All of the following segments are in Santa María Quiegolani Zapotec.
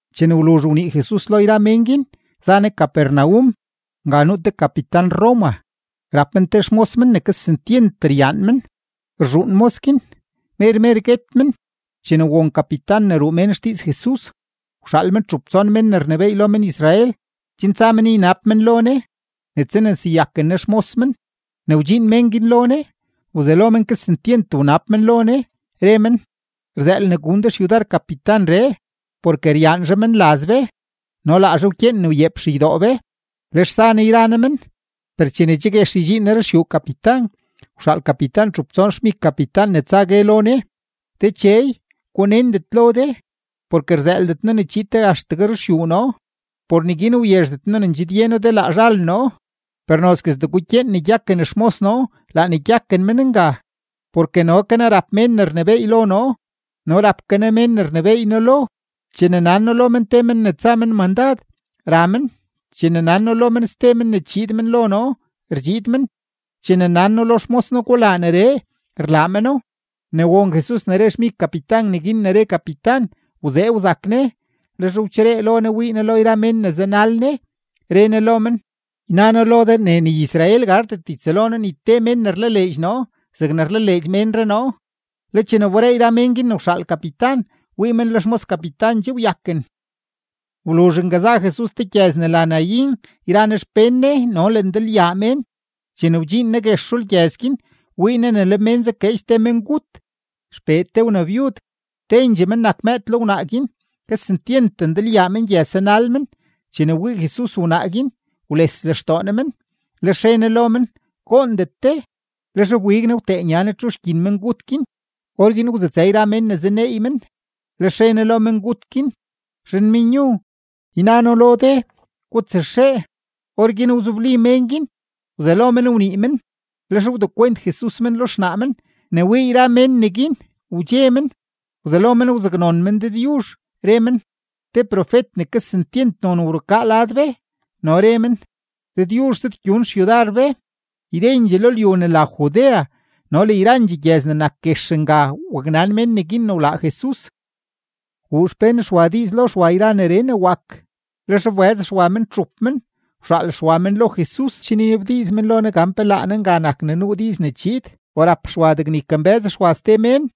Chene wluzh wnii Jesus lo yra mén guin, za Ne Capernaum. Nga nuu te kapitan-Roma; rap men te xmos men ne kesentyent ryaan men; rzhuun mos guin, mer mer guet men. Chene won kapitan ne ruu mén xdiiz Jesus, wxaal men txup tson mén ne rnebééy lo men-Israel, chen tsa men ynab men lo Ne ne tsaneseyaken Ne xmos men. Ne wdxiin mén guin lo Ne, wzelo men kesentyent wnab men lo Ne, re men: ―Rzëël ne gun de xyudar kapitanree, porke ryaan zhaa menlaz be no laa zhaa wkyeen ne wyeep xeydoo be. Lex za Ne yra Ne men; per chene che guex ydxiin Ne ruxyuu kapitan, wxaal kapitan txup tson xmig kapitan ne tsa gue lo Ne: ―Dechey, gunendet lo de, porke rzëëldet noo ne chiid de axtegue ruxyuu noo. Por neguin wyezhdet noo ne ndxidye noo de laa zhal noo. Per nozguestee gukyeen ne gyaken xmos noo, laa ne gyaken men nga. Porke no ke noo rap mén ne rnebééy lo noo, no rap ke noo mén ne rnebééy noo lo. Chene nan noo lo men te men ne tsa men mandad, ra men; chene nan noo lo men ste men ne chiid men lo noo, rdxiid men; chene nan noo lo xmos noo: “Gulaa neree”, rlaa meno. Ne won Jesus ne re xmig kapitan neguin ne re kapitan, wzee wzak Ne, lex wcheree lo Ne wii Ne lo yra mén ne zanal Ne, re Ne lo men: ―Yna noo lo de ne ni Israel gardet ytsëlo noo ni te mén ne rlaleedx noo zegne rlaleedx ménree noo. Le chene wberee yra men guin ne wxaal kapitan, wii men le xmos kapitan che wyaken. Wluzh nga za Jesus te gyëz ne la Naín yra Ne xpén Ne no le ndalyaa mén. Chene wdxiin Ne guex rulgyëz guin, wii Ne le mén zakeedx te mengut, xpee te wnabyud; tendxee men nak mëëd lo wnaa guin. Kesentyent ndalyaa mengyëz zanal men. Chene wii Jesus wnaa guin, wles lextoo Ne men, lex re Ne lo men: ―Goondet de. Lex wbig Ne wtee nya Ne txu gyin ne nuu mengut guin; orguin wzutsë yra mén ne zaneey men, lex re Ne lo mengut guin: ―Zhanmenyu, yna noo lo de: ¡Gutsaxee! Orguin wzobli mén guin, wzelo men wnii men, lex wdekwent Jesus men lo xnaa men. Ne wii yra mén neguin, wdxe men, wzelo men wzaknon men Dëdyuzh, re men: ―Te profet ne kesentyent non wrukaa lad be. No re men: ―Dëdyuzh zëdgyun xyudar be. Ydendxee lo lyu ne la Judea no le yrandxee gyëz ne nak guex nga waknan mén neguin ne wlaa Jesus. Wuu xpén Xwa diiz lo Xwa yra neree ne wak. Lex wbëz Xwa men txup men, wxaal Xwa men lo Jesus chen ynabdiiz men lo Ne gan pe laa Ne nga nak ne nuu diiz ne chiid o rap Xwa degne ykambë́z Xwa ste mén.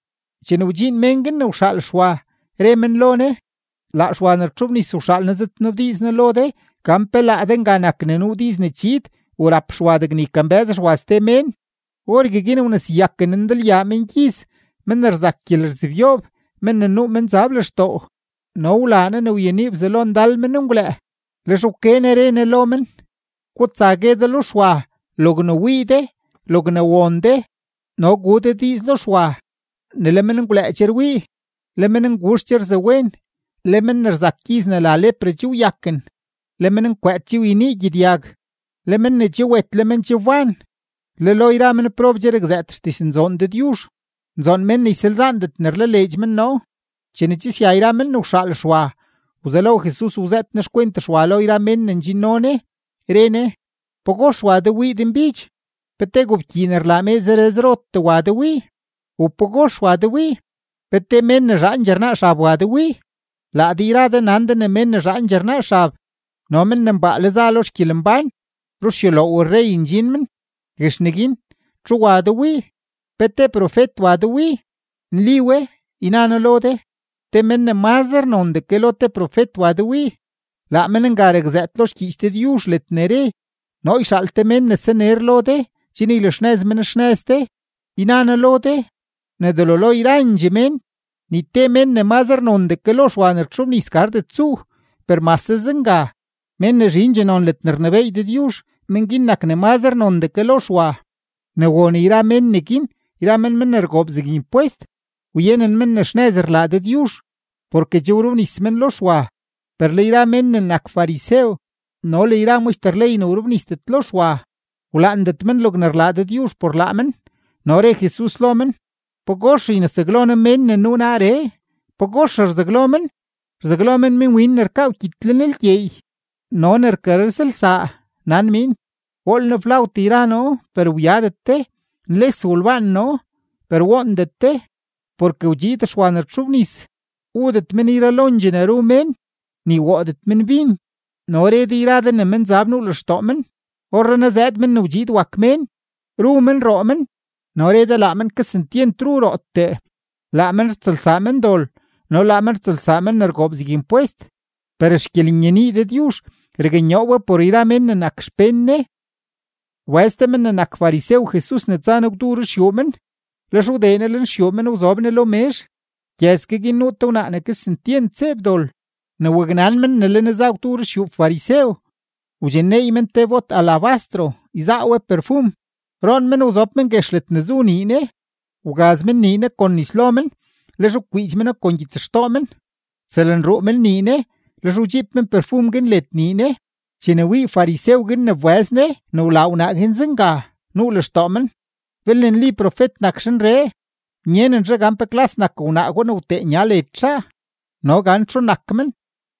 Chene wdxiin mén guin ne wxaal Xwa, re men lo Ne: ―Laa Xwa ne rtxobnis wxaal noo zëdnabdiiz noo lo de gan pe laa de nga nak ne nuu diiz ne chiid u rap Xwa degne ykambë́z Xwa ste mén. Orgueguin wneseyaken Ne ndalyaa mengyiz, men ne rzak gyelerzebyoob, men ne nuu menzab lextoo, no wlaa Ne ne wyenii bzalo ndal menngwlëë. Lex wke Ne re Ne lo men: ―Gutsa gue de lo Xwa logne wii de, logne won de. No gu de diiz lo Xwa ne le menngwlëë che rwii, le mennguzh che rzawen, le men ne rzak gyiz ne la lepra che wyaken, le mennkwëët che wyenii gyedyag, le men ne che wet le men che wban, le lo yra menprob che rakzëët xdiznzoon Dëdyuzh. Nzoon men ne ysalzaandet ne rlaleedx men noo. Chene che sya yra men ne wxaal Xwa, wzelo Jesus wzëët Ne xkwent Xwa lo yra mén ne ndxinno Ne, re Ne: ―¿Pagox wa de wii denbidx? ¿Pe te gobkyii ne rlaa mee zere zerotee wa de wii? ¿U pagox wa de wii? ¿Pe te mén ne zhaandxee rnaa xab wa de wii? Laa de yra de nan de ne men ne zhaandxee rnaa xab no men ne mbaale za lo xgyelembán, ruxyuloow rrey ndxin men. Guex neguin, ¿txu wa de wii? ¿Pe te profet wa de wii? Nli we, yna noo lo de, te men ne mazre nondee ke lo te profet wa de wii. Laa men nga rakzëët lo xgyiich Dëdyuzh ledne re: Noo yxaal te mén ne saner lo de chen ylaxnëz men xnëz de. Yna noo lo de ne delo lo yrandxee mén, ni te men ne mazre nondee ke lo Xwa ne rtxobnis gardet tsuu; per mase zenga, mén ne zhindxee non ledne rnebééy Dëdyuzh, men guin nak ne mazre nondee ke lo Xwa. Ne won yra mén neguin yra men men ne rgoob zeg impwest, wyenen men ne xnëz rlaa Dëdyuzh porke che wrobnis men lo Xwa. Per le yra men ne nak farisew no le yra maxter ley ne wrobnisdet lo Xwa, wlaandet men logne rlaa Dëdyuzh por laa men. No re Jesus lo men: ―¿Pagox ynesaglo noo mén ne nuu naaree? ¿Pagox rzaglo men? Rzaglo men minwin ne rkaa wkyit lenlgyeey no ne rkarëzlsaa, nan miin: “Wool noo flawt yra noo, per wyadet de. Nles wolbaan noo, per woondet de.” Porke wdxiid Xwa ne rtxobnis, wudet men yralondxee ne ru mén, ni woodet men bin, no re de yra de ne menzab nuu lextoo men. Orrenaa zëëd Men ne wdxiid wak Mén, ru men, roo men, no re de, laa men kesentyent ru rootee, laa men rtsëlsaa mendol no laa men rtsëlsaa men ne rgoob zeg impwest. Per xgyelenyenii Dëdyuzh raknyoo we por yra mén ne nak xpén Ne. Wbëz te men ne nak farisew Jesus ne tsa Ne gwdu ruxyuu men; lex wdee Ne lenxyuu men wzob Ne lo mezh. Gyëz ke guin nuu te wnaa ne kesentyent zeeb dol. Ne waknan men ne le Ne za gwdu ruxyuu farisew, wdxinneey men te bot alabastro, yzaa we perfum. Roon men, wzob men guex ledne zu nii Ne; wgaz men nii Ne kon nis lo men, lex wkwiidx meno kon gyitsxtoo men; wtsëlruu men nii Ne, lex wdxiib men perfum guin led nii Ne. Chene wii farisew guin ne wbëz Ne ne wlaa wnaa guin zenga, nuu lextoo men: “Belne nli profet nak zhanree, nyenen zhaa gan pe klas nak wnaa gwa ne wtee nya led zhaa no gan txu nak men,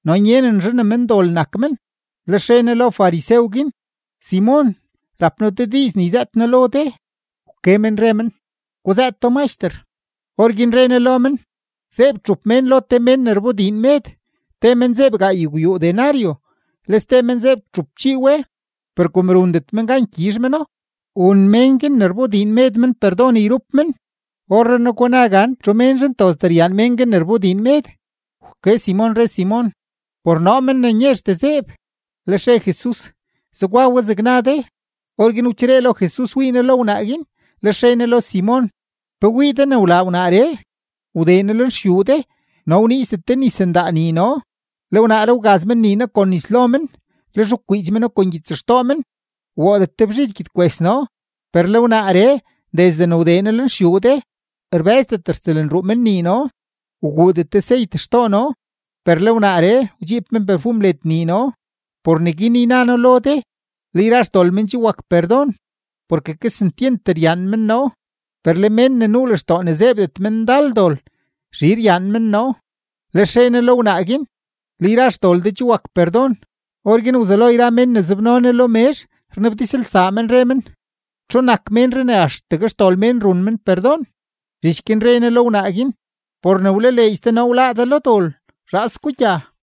no nyenen zhaa ne mendol nak men.” Lex re Ne lo farisew guin: ―Simon, rap noo te diiz ne yzëët noo lo de. Wke men re men: ―Guzëëto, Maxter. Orguin re Ne lo men: ―Zeeb txup mén lo te men ne rbodiin med. Te men zeeb gaaygwyuu denario, le ste men zeeb txupchii we. Per kom rundet men gan gyizh meno, wun mén guin ne rbodiin med men perdon yrup men. Orrenaa, guna gan ¿txu menzhe ntozdee gyaan men guin ne rbodiin med? Wke Simon, re Simon: ―Por noo, men ne nyezhdee zeeb. Lex re Jesus: ―Zegwa we zeg na de. Orguin wcheree lo Jesus wii Ne lo wnaa guin, lex re Ne lo Simon: ―¿Pe wii de ne wlaa wnaaree? Wdee noo lenxyuu de, no wniizdet de nis ndaa nii noo; le wnaaree wgaz men nii noo kon nis lo men, lex wkwiidx meno kon gyitsxtoo men. Woodet de bzhid gyedkwes noo, per le wnaaree desde ne wdee noo lenxyuu de, rbë́zdet rtsëlruu men nii noo. Wguudet de seyt xtoo noo, per le wnaaree wdxiib men perfum led nii noo. Por neguin yna noo lo de, le yra xdol men che wak perdon, porke kesentyent ryaan men noo; per le mén ne nuu lextoo ne zeebdet men ndal dol, zhi ryaan men noo. Lex re Ne lo wnaa guin: ―Le yra xdol de che wak perdon. Orguin wzelo yra mén ne zobno Ne lo mezh rnabdizlsaa men, re men: ―¿Txu nak ménree ne axtegue xdol mén run men perdon? Zhich guin re Ne lo wnaa guin: ―Por ne wlaleedx de noo, wláá de lo dol. Zhaas gugya.